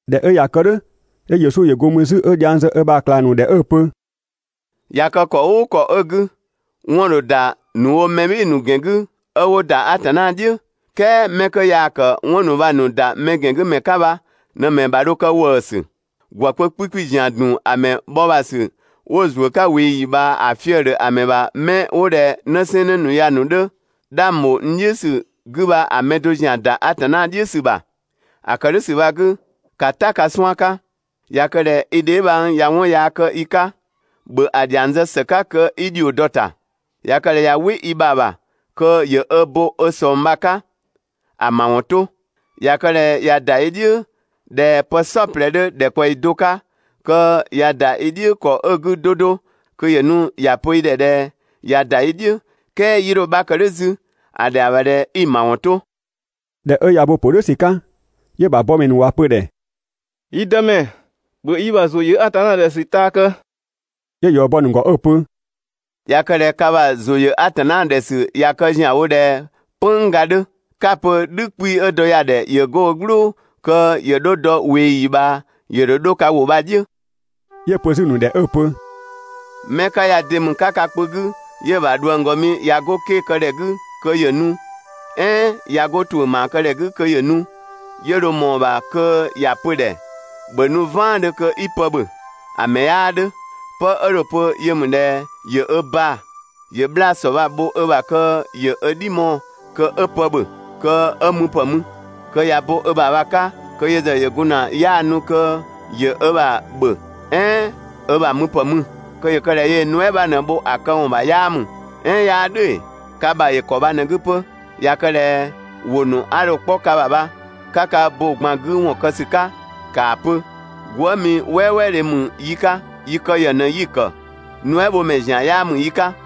꞊Dhɛ 'ö ꞊ya kë "dhʋ̈, 'yö Yesu ‑yö go mü 'zü 'ö dhiang zë ö ‑bha ꞊klang ‑nu ‑dhɛ 'ö‑ pö: ꞊Ya kë ‑kɔ "ʋʋ ‑kɔ 'ö 'gü, 'wɔn‑ ‑dho ‑da ‑nu wo mɛ "bhɩɩ‑ ‑nu ‑gɛn 'gü 'ö 'wo ‑da Atanna "dhiʋ̈, "kɛɛ 'mɛ 'kö yaa‑ ‑kë 'wɔn ‑nu bha‑ ‑nu ‑da mɛ ‑gɛn 'gü ‑mɛ 'ka bha ꞊në‑ ‑mɛ bha dho kë ‑wëësü. ‑Gwë kpö 'kpikpi ‑zian ‑dun ‑a ‑mɛ bhɔ ‑bha ‑sü 'wo‑ ‑zuö 'ka ꞊weeyi ꞊bhaa ‑a fië‑ ‑dhö ‑a ‑mɛ ‑bha 'mɛ 'wo ꞊dhɛ 'në 'sɛɛnnë ‑nu ya‑ ‑nu 'dhö 'dhang ‑bho n "dhiʋ̈ ‑sü 'gü bha mɛ do zian ‑da Atanna "dhiʋ̈ ‑sü ‑bha. ‑A ‑kë "dhʋ̈ ‑sü bha‑ 'gü, ‑ka "ta ka 'suan‑ 'ka. ꞊Ya kë ꞊dhɛ i dheebhang ꞊ya 'wɔn yaa kë i 'ka, ‑bhö ‑a ‑dhiang zë ‑së 'ka kö 'i ‑dhio dɔ‑ ‑ta. ꞊Ya kë ꞊dhɛ ꞊ya "wɩ i ‑bha ‑bha kö ‑yö ö bo ö ꞊sɔng bha‑ 'ka, ‑a ‑mawɔn 'to. ꞊Ya kë ꞊dhɛ ꞊ya ‑da i "dhiʋ̈ ꞊dhɛ pë "saɔplɛ 'dhö ‑dhɛkpaɔyi do 'ka, kö ꞊ya ‑da i "dhiʋ̈ ‑kɔ 'ö‑ 'gü 'do 'do kö ‑yö nu ‑ya pö i ‑dhɛ ꞊dhɛ 'ya ‑da i "dhiʋ̈, "kɛɛ 'yii 'dho‑ 'bha kë "dhʋ̈ 'zü, ‑a ‑dhɛa ‑bha ꞊dhɛ 'i‑ ‑mawɔn 'to. ꞊Dhɛ 'ö ꞊ya ö bo‑ ‑pö "dhʋ̈ ‑sü 'ka, 'yö‑ ‑bha bɔmɛ ‑nu ‑wa pö‑ ‑dhɛ: «Yi Dëmɛ, ‑bhö yi ‑bha ‑zʋ ‑yö Atanna ‑dhɛ ‑sü taa kë!» 'Yö‑ ‑yɔ bɔ‑ ‑nu ‑gɔ 'ö‑ pö: «꞊Ya kë ꞊dhɛ ka ‑bha ‑zʋ ‑yö Atanna ‑dhɛ ‑sü ꞊ya kë ‑zianwo ꞊dhɛ "pënngga 'dhö, 'ka‑ pö "dhü 'kpii‑ 'ö dɔ ya‑ ‑dhɛ ‑yö 'go ö "gblʋʋ kö ‑yö 'dho dɔ ꞊weeyi ꞊bhaa, ‑yö ‑dho 'dho ka ‑wʋ bha‑ "dhiʋ̈.» 'Yö‑ pö 'zü‑ ‑nu ‑dhɛ 'ö‑ pö: «'Mɛ 'ka ya de ‑mü 'ka ka kpö 'gü 'yö‑ ‑bha ꞊dhuënggɔmi ꞊ya 'go 'ke‑ kë ‑dhɛ 'gü kö ‑yö nu, "ɛɛn ꞊ya 'go ‑tuʋ̈ ‑maa kë ‑dhɛ 'gü kö ‑yö nu, 'yö dho ꞊mɔɔ‑ ‑bha kö ‑ya pö‑ ‑dhɛ: «‑Bhö nu "vaandhö kö 'i pë ‑bhö? ‑A ‑mɛ 'yaa 'dhö. 'Pë 'ö dho‑ pö yö ‑mü ꞊dhɛ ‑yö ö baa‑, ‑yö 'bhlaa‑ ‑sɔ bha‑ bho ö ‑bha kö ‑yö ö "dhi mɔɔ‑ kö 'ö pë ‑bhö kö 'ö müpë mü. Kö ꞊ya bo ö ‑bha bha‑ 'ka kö yö ‑zë ‑yö gun ‑na 'yaanu kö ‑yö ö ‑bha ‑bhö "ɛɛn ö ‑bha müpë mü. Kö ‑yö kë ꞊dhɛ yöö‑ nuɛ" 'bha ꞊në‑ bho ‑a këwɔn ‑bha 'yaa ‑mü. "Ɛɛn 'yaa "dhʋ̈ ‑ee? Ka ‑bha ‑yö ‑kɔ bha ꞊në‑ 'gü 'pö. ꞊Ya kë ꞊dhɛ ‑wʋ ‑nu 'a dho‑ 'kpɔ ka ‑bha bha, 'ka ka bo‑ ꞊gban 'gü ‑wɔn kë ‑sü 'ka, ‑kaa pö: «Gwëëmi "wɛɛwɛɛdhe ‑mü yi 'ka, yi kë ‑yë ꞊në 'yi‑ ‑kë, nuɛbhomɛ ‑zian 'yaa ‑mü yi 'ka.»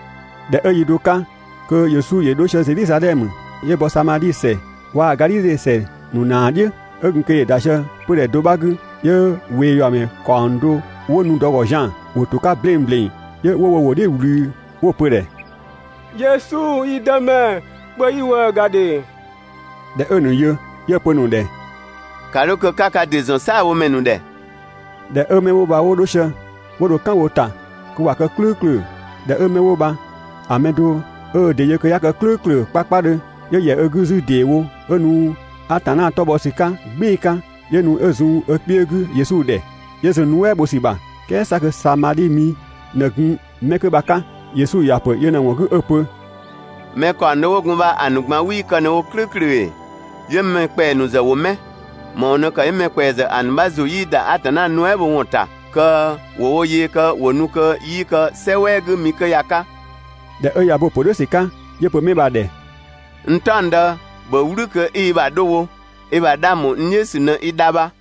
꞊Dhɛ 'ö yi do 'ka kö Yesu ‑yö 'dho sië Zedhizadhɛmö, 'yö bɔ Samadhi ‑sɛ waa‑ Gadhidhe ‑sɛ ‑nu ‑naa "dhiʋ̈. 'Ö gun kö ‑yö ‑da sië 'pödhɛ do 'bha 'gü, 'yö ꞊weeyuamɛ ‑kaɔng do 'wo nu dɔ‑ ‑gɔ zian‑, ‑wo ‑to 'ka 'bleng ‑bleng, 'yö 'wo wo ‑wʋ "dhiʋ̈ ꞊wlü 'wo‑ pö‑ ‑dhɛ: «Yesu yi Dëmɛ, ‑bhö yi ‑wëë ‑ga ‑dhe!» ꞊Dhɛ 'ö‑ ‑nu yö, 'yö‑ pö‑ ‑nu ‑dhɛ: «‑Ka 'dho kö 'ka ka ‑dɩ ‑zɔn "saabhomɛ ‑nu ‑dhɛ!» ꞊Dhɛ 'ö 'mɛ 'wo bha 'wo 'dho sië, 'wo dho "kan wo ‑ta kö ꞊wa kë "klʋ̈ʋ̈klʋ̈. ꞊Dhɛ 'ö 'mɛ 'wo bha‑ mɛ do 'ö ö ‑dɩ yö kö 'ya kë "klʋ̈ʋ̈klʋ̈ 'kpakpadhö, 'yö ‑yɛ ö 'gü 'zü ‑deewo 'ö nu Atanna 'tɔ bhɔ ‑sü 'ka "gbɩɩ‑ 'ka. 'Yö nu 'ö zun ö kpiö 'gü Yesu ‑dhɛ, 'yö zun‑ nuɛ" bho ‑sü ‑bha, "kɛɛ 'sa kö Samadhi mi ꞊në gun 'mɛ 'kö bha‑ 'ka. Yesu ‑ya ‑pö yö ꞊në‑ ‑wɔn 'gü 'ö‑ pö: «Mɛ ‑kaɔng do 'wo gun bha, ‑a ‑nu ꞊gban 'wii kë ꞊në wo "klʋ̈ʋ̈klʋ̈ ‑ee? 'Yö‑ mɛ ‑kpɛa ‑nu ‑zë ‑wo 'mɛ? ‑Më ‑wɔn ꞊në ‑kë 'yö‑ mɛ ‑kpɛa ‑zë ‑a ‑nu 'bha ‑zʋ 'yii ‑da Atanna nuɛ" bho ‑wɔn ‑ta kö ‑wo wo yee kë ‑wo nu kö 'yii kë "sɛ "wɛɛ 'gü mi 'kö ya‑ 'ka?» ꞊Dhɛ 'ö ꞊ya ö bo‑ ‑pö "dhʋ̈ ‑sü 'ka, 'yö‑ pö 'mɛ 'bha‑ ‑dhɛ: «N "taɔngdë, ‑bhö "wlü kö 'i i ‑bha 'dho wo; i ‑bha 'dhang ‑bho n "dhiʋ̈ ‑sü ꞊në i dha bha.»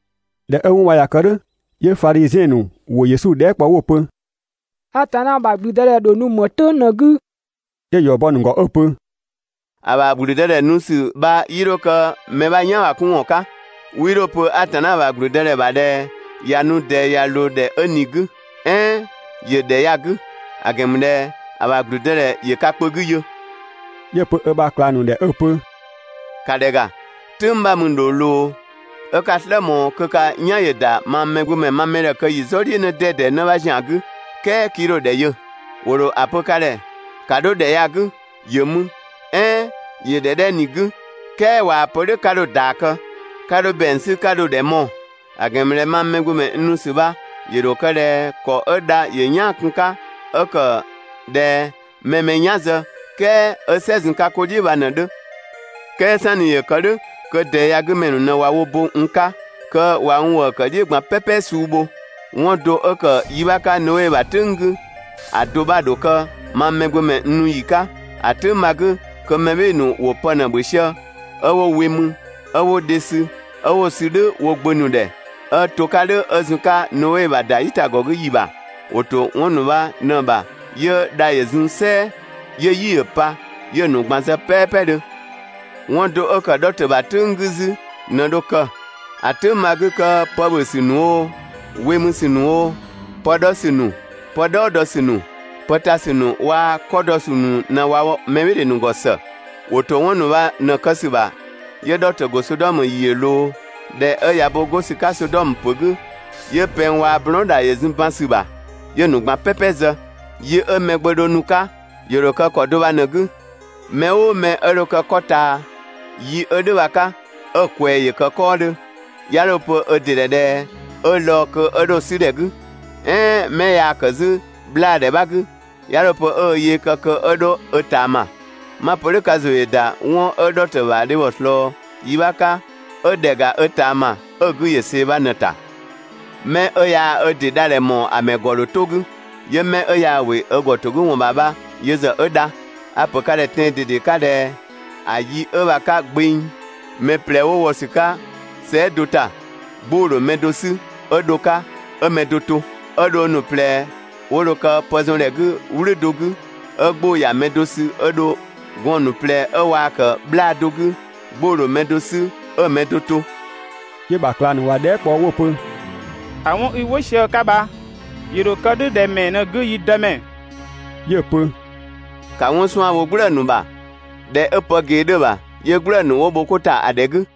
꞊Dhɛ 'ö 'wɔn bha ꞊ya kë "dhʋ̈, 'yö Fadhiziɛn ‑nu ‑wo Yesu dhɛɛ" kpɔ 'wo‑ pö: «Atanna ‑bha ‑gblüdëdhɛ ‑dho nu ‑më "tʋ̈ng ꞊në‑ 'gü?» 'Yö‑ ‑yɔ bɔ‑ ‑nu ‑gɔ 'ö‑ pö: «‑A ‑bha ‑gblüdëdhɛ ‑bha nu ‑sü bha 'yii 'dho kë mɛ 'bha "yan ‑bha 'kun ‑wɔn 'ka. 'Wii 'dho‑ pö: «Atanna ‑bha ‑gblüdëdhɛ ‑bha ꞊dhɛ ꞊ya nu ꞊dɛɛ ꞊ya ꞊loo ‑dhɛ 'ö ꞊ni‑ 'gü!», "ɛɛn: «‑Yö ‑dhɛ 'dhɛ ya‑ 'gü!»; ‑a ‑gɛn ‑mü ꞊dhɛ ‑a ‑bha ‑gblüdëdhɛ ‑yö ka kpö 'gü yö.» 'Yö‑ pö ö ‑bha ꞊klang ‑nu ‑dhɛ 'ö‑ pö: «‑Ka ‑dhɛ ‑ga, "tʋ̈ng 'bha‑ mü ‑dho ꞊loo 'ö 'ka‑ "slë ꞊mɔɔ kö ka "yan ‑yö ‑da mang Mɛgbömɛ ma mɛdhɛ kë ‑yi "zɔ "dhiʋ̈ 'në 'dɛdɛ 'në 'bha ‑zian 'gü, "kɛɛ 'kii 'dho‑ ‑dhɛ yö. ‑Wo ‑dho ‑a pö ka ‑dhɛ: «‑Ka 'dho ‑dhɛ ya‑ 'gü, ‑yö mü!» "ɛɛn: «‑Yö ‑dhɛ 'dhɛ ꞊ni‑ 'gü!», "kɛɛ ꞊waa‑ pö "dhʋ̈ 'ka 'dho‑ ‑yɔ bɔ, 'ka 'dho ‑bɛang 'sü 'ka dho‑ ‑dhɛ mɔɔ‑; ‑a ‑gɛn ‑mü ꞊dhɛ mang Mɛgbömɛ n nu ‑sü bha ‑yö ‑dho kë ꞊dhɛ ‑kɔ 'ö dha ‑yö "yaan‑ kun‑ 'ka, 'ö ‑kë ꞊dhɛ mɛ‑ mɛ "yan zë, "kɛɛ 'ö "sɛ zun‑ 'ka 'ko "dhiʋ̈ bha ꞊në‑ 'dhö. "Kɛɛ "sanni ‑yö kë "dhʋ̈, kö ꞊dɛɛ ya‑ 'gü ‑mɛ ‑nu ꞊në ꞊wa wo bo n 'ka, kö ꞊wa n ‑wëë ‑kë "dhiʋ̈ ꞊gban "pɛpɛ suu bho. 'Wɔn do 'ö ‑kë yi 'bha 'ka Noe ‑bha "tʋ̈ng 'gü, ‑a do 'bha ‑dho kë mang Mɛgbömɛ n nu ‑yi 'ka. ‑A "tʋ̈ng bha‑ 'gü kö mɛ "bhɩɩ‑ ‑nu ‑wo pë ꞊në ‑bhö sië, 'ö 'wo we mü, 'ö 'wo dhe sü, 'ö 'wo‑ sü "dhʋ̈ wo gbö ‑nu ‑dhɛ 'ö 'to‑ 'ka "dhʋ̈ 'ö zun‑ 'ka Noe ‑bha ‑da "yitagɔ 'gü ‑yi ‑bha. ‑wo ‑to 'wɔn ‑nu bha ꞊në‑ ‑bha 'yö dha ‑yö zun "sɛɛ, 'yö "yi ‑yö pa, 'yö‑ ‑nu ꞊gban zë "pɛɛpɛdhö. 'Wɔn do 'ö ‑kë Dhɔtö ‑bha "tʋ̈ng 'gü 'zü ꞊në dho kë. ‑A "tʋ̈ng bha‑ 'gü kö pë ‑bhö ‑sü ‑nu oo, we mü ‑sü ‑nu oo, pë 'dhɔ ‑sü ‑nu, pë "dhɔɔ dɔ ‑sü ‑nu, pë ta ‑sü ‑nu waa‑ 'kɔ dɔ ‑sü ‑nu ꞊në ꞊wa wɔ mɛ "bhɩɩ‑ ‑nu ‑gɔ ‑së. ‑Wo ‑to 'wɔn ‑nu bha ꞊në‑ kë ‑sü ‑bha, 'yö Dhɔtö ‑go Sodɔmö ‑yi ‑yö ꞊loo. ꞊Dhɛ 'ö ꞊ya bo 'go ‑sü 'ka Sodɔmö ‑pö 'gü, 'yö pɛng waa‑ blɔɔn" ‑dha ‑yö zun ban ‑sü ‑bha, 'yö‑ ‑nu ꞊gban "pɛpɛ zë. Yi 'ö Mɛgbömɛ dho nu‑ 'ka, ‑yö ‑dho kë ‑kɔ do bha ꞊në‑ 'gü. Mɛ "ʋʋ mɛ 'ö dho kë 'kɔ ꞊taa yi 'ö "dhʋ̈ bha‑ 'ka, 'ö‑ ꞊kwɛɛ yaa‑ ‑kë 'kɔɔdhö, 'ya 'dho‑ pö ö ‑dɩ ‑dhɛ ꞊dhɛ 'ö lɔɔ‑ kö 'ö dho‑ 'sü ‑dhɛ 'gü, ‑ɛɛ 'mɛ yaa‑ ‑kë 'zü 'bhlaadhɛ 'bha 'gü, 'ya 'dho‑ pö 'ö ö yee kë kö 'ö 'dho ö ꞊taama. 'Ma‑ pö "dhʋ̈, ka ‑zʋ ‑yö ‑da 'wɔn 'ö Dhɔtö ‑bha dhebhɔ ꞊slɔɔ yi 'bha 'ka ('ö ‑dhɛ ‑ga ö ꞊taama 'ö‑ 'gü ‑yö see‑ bha ꞊në‑ ‑ta). 'Mɛ 'ö yaa ö ‑dɩ dha ‑dhɛ ‑mɔɔ ‑a ‑mɛ ‑gɔ ‑dho 'to‑ 'gü. 'Yö 'mɛ 'ö yaa ‑wɩ ö ‑gɔ ‑to 'gü ‑wɔn ‑bha bha yö ‑zë 'ö dha. A‑ ‑pö ka ‑dhɛ tɛan‑ ꞊dede 'ka ꞊dhɛ: ‑A yi 'ö bha‑ 'ka gbeng, mɛ ꞊plɛ 'wo wɔ ‑sü 'ka sɛɛ" do ‑ta, 'gbʋ‑ ‑dho mɛ do 'sü 'ö dho‑ 'ka 'ö‑ mɛ do to. 'Ö dhong ‑nu ꞊plɛ 'wo dho kë pë zɔn ‑dhɛ 'gü "wlʋ̈ do 'gü, 'ö 'gbʋ‑ ‑ya mɛ do sü 'ö‑ mɛ do to. Gɔɔn‑ ‑nu ꞊plɛ 'ö waa‑ ‑kë 'bhlaa‑ do 'gü, 'gbʋ‑ ‑dho mɛ do 'sü 'ö‑ mɛ do to.» 'Yö‑ ‑bha ꞊klang ‑nu ‑wa dhɛɛ" kpɔ 'wo‑ pö: «‑A 'wɔn 'i "wɩ sië‑ 'ka bha, ‑yö ‑dho kë "dhʋ̈ ‑dhɛ ‑mɛɛ ꞊në‑ 'gü, yi Dëmɛ?» 'Yö‑ pö: «‑Ka 'wɔn 'suan‑ bho "gblëë‑ ‑nu bha. ‑Dhɛ 'ö pë ꞊gee 'dhö‑ ‑bha, 'yö "gblëë‑ ‑nu ‑wo bho 'ko ‑ta ‑a ‑dhɛ 'gü.